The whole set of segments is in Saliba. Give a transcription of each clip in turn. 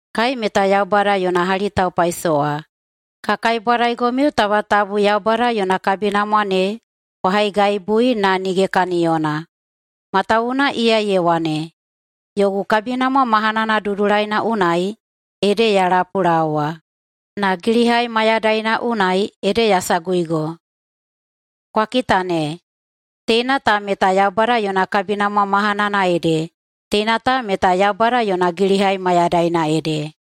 Kai meta Yaubada yona hali taupaisowa, ka kaibwadaigomiu taba tabu Yaubada yona kabinamwa ne kwa haigaibui na nige kaniyona. Matawuwuna iya ye wane, “Yogu kabinamwa mahanana dudulaina unai ede ya lapulaowa, na gilihai mayadaina unai ede ya saguigo.” Kwa kita ne, teina ta meta Yaubada yona kabinamwa mahanana ede, teina ta meta Yaubada yona gilihai mayadaina ede.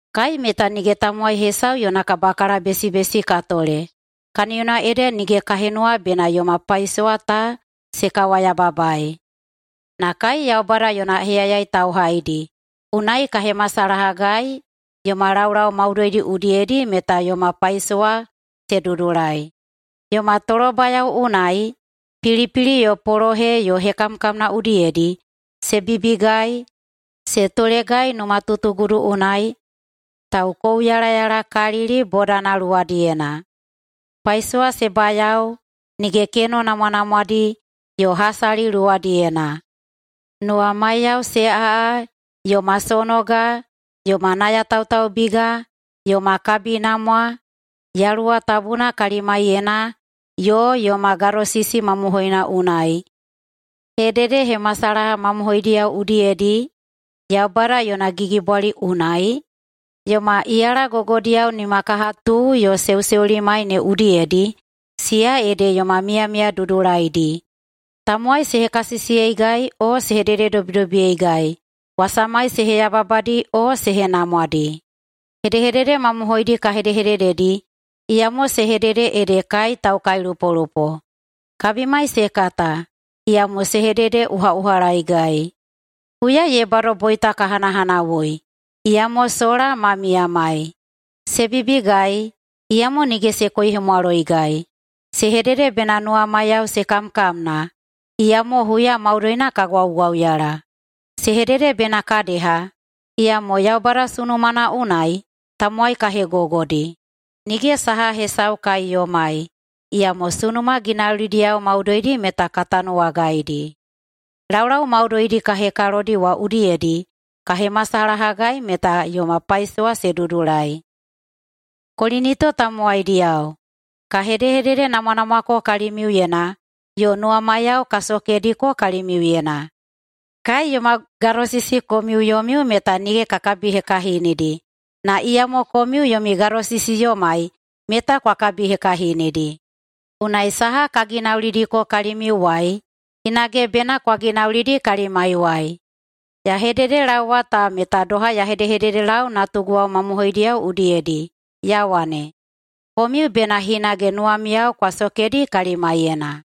Kai meta nige tamowai hesau yona kabakalabesibesi ka tole, kaniyona ede nige ka henuwa bena yoma paisowa ta se kawayababaei. Na kai Yaubada yona heyayai tauhaidi, unai ka hemasalahagai yoma laulau maudoidi udiyedi meta yoma paisowa se dudulai: Yoma tolobayao unai, pilipili yo polohe yo hekamkamna udiyedi, se bibigai, se tolegai numatutugudu unai, taukouyalayalakalili bodana luwadiyena, paisowa se bayao, nige keno namwanamwadi, yo hasali luwadiyena, nuwamaiyao se aꞌa, yoma sonoga, yoma nayatautaubiga, yoma kabinamwa, Yaluwa Tabuna kalimaiyena, yo yoma gadosisi mamohoina unai, hededehemasalaha mamohoidiyao udiyedi, Yaubada yona gigibwali unai, yoma iyala gogodiyao nimakahatu yo seuseulimai ne udiyedi, siya ede yoma miyamiya dudulaidi, tamowai se hekasisiyeigai o se hedededobidobiyeigai, wasamai se heyababadi o se henamwadi. Hedehedede mamohoidi ka hedehedededi, iyamo se hedede ede kai taukailupolupo. Kabimai se kata, iyamo se hededeꞌuhaꞌuhalaeigai. Huya ye bado boita ka hanahanawui, iyamo sola ma miyamai. Se bibigai, iyamo nige se koihemwaloigai. Se hedede bena nuwamaiyao se kamkamna, iyamo huya maudoina ka gwaugwauyala. Se hedede bena ka deha, iyamo Yaubada sunumana unai tamowai ka hegogodi. Nige saha hesau kai yomai, iyamo sunuma ginaulidiyao maudoidi meta ka tanuwagaidi. [Laulau maudoidi ka hekalodi wa udiyedi ka hemasalahagai meta yoma paisowa se dudulai.] Kolinito tamowaidiyao, ka hedehededenamwanamwako kalimiuyena yo nuwamaiyao ka sokediko kalimiuyena. Kai yoma gadosisi komiu yomiu meta nige ka kabihekahinidi, na iyamo komiu yomi gadosisi yomai meta kwa kabihekahinidi. Unai saha ka ginaulidiko kalimiuwai hinage bena kwa ginaulidi kalimaiwai. Ya hededelaowa ta meta doha ya hedehededelau natuguwao mamohoidiyao udiyedi ya wane, komiu bena hinage nuwamiyao kwa sokedi kalimaiyena.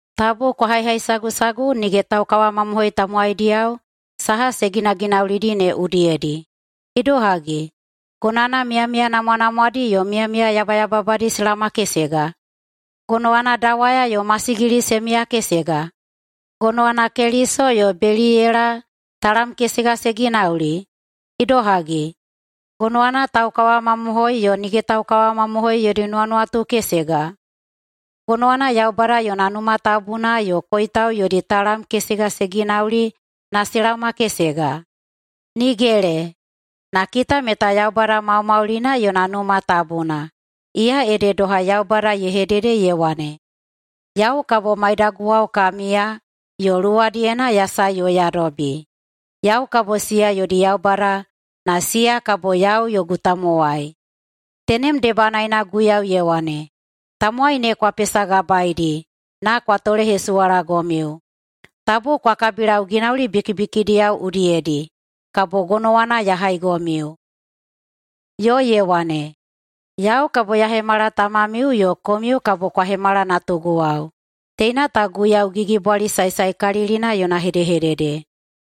Tabu kwa haihaisagusagu nige taukawamamohoi tamowaidiyao saha se ginaginaulidi ne udiyedi. Idohagi, gonowana miyamiya namwanamwadi yo miyamiya yabayababadi se laomakesega? Gonowana dawaya yo masigili se miyakesega? Gonowana Keliso yo Beliyela talam kesega se ginauli? Idohagi, gonowana taukawamamohoi yo nige taukawamamohoi yodi nuwanuwatu kesega? Gonowana Yaubada yona Numa Tabuna yo koitau yodi talam kesega se ginauli na se laomakesega? Nigele! Na kita meta Yaubada maumaulina yona Numa Tabuna. Iya ede doha Yaubada ye hedede ye wane, “Yau kabo maidaguwao ka miya yo luwadiyena ya sae yo ya dobi. Yau kabo siya yodi Yaubada na siya kabo yau yogu tamowai.” Tenem debanaena Guiyau ye wane, “Tamowai ne kwa pesagabaedi na kwa tolehesuwalagomiu. Tabu kwa kabilau ginauli bikibikidiyao udiyedi, kabo gonowana ya haigomiu.” Yo ye wane, “ ‘Yau kabo ya hemala tamamiu yo komiu kabo kwa hemala natuguwao,’ teina ta Guiyau Gigibwali Saesaekalilina yona hedehedede.”.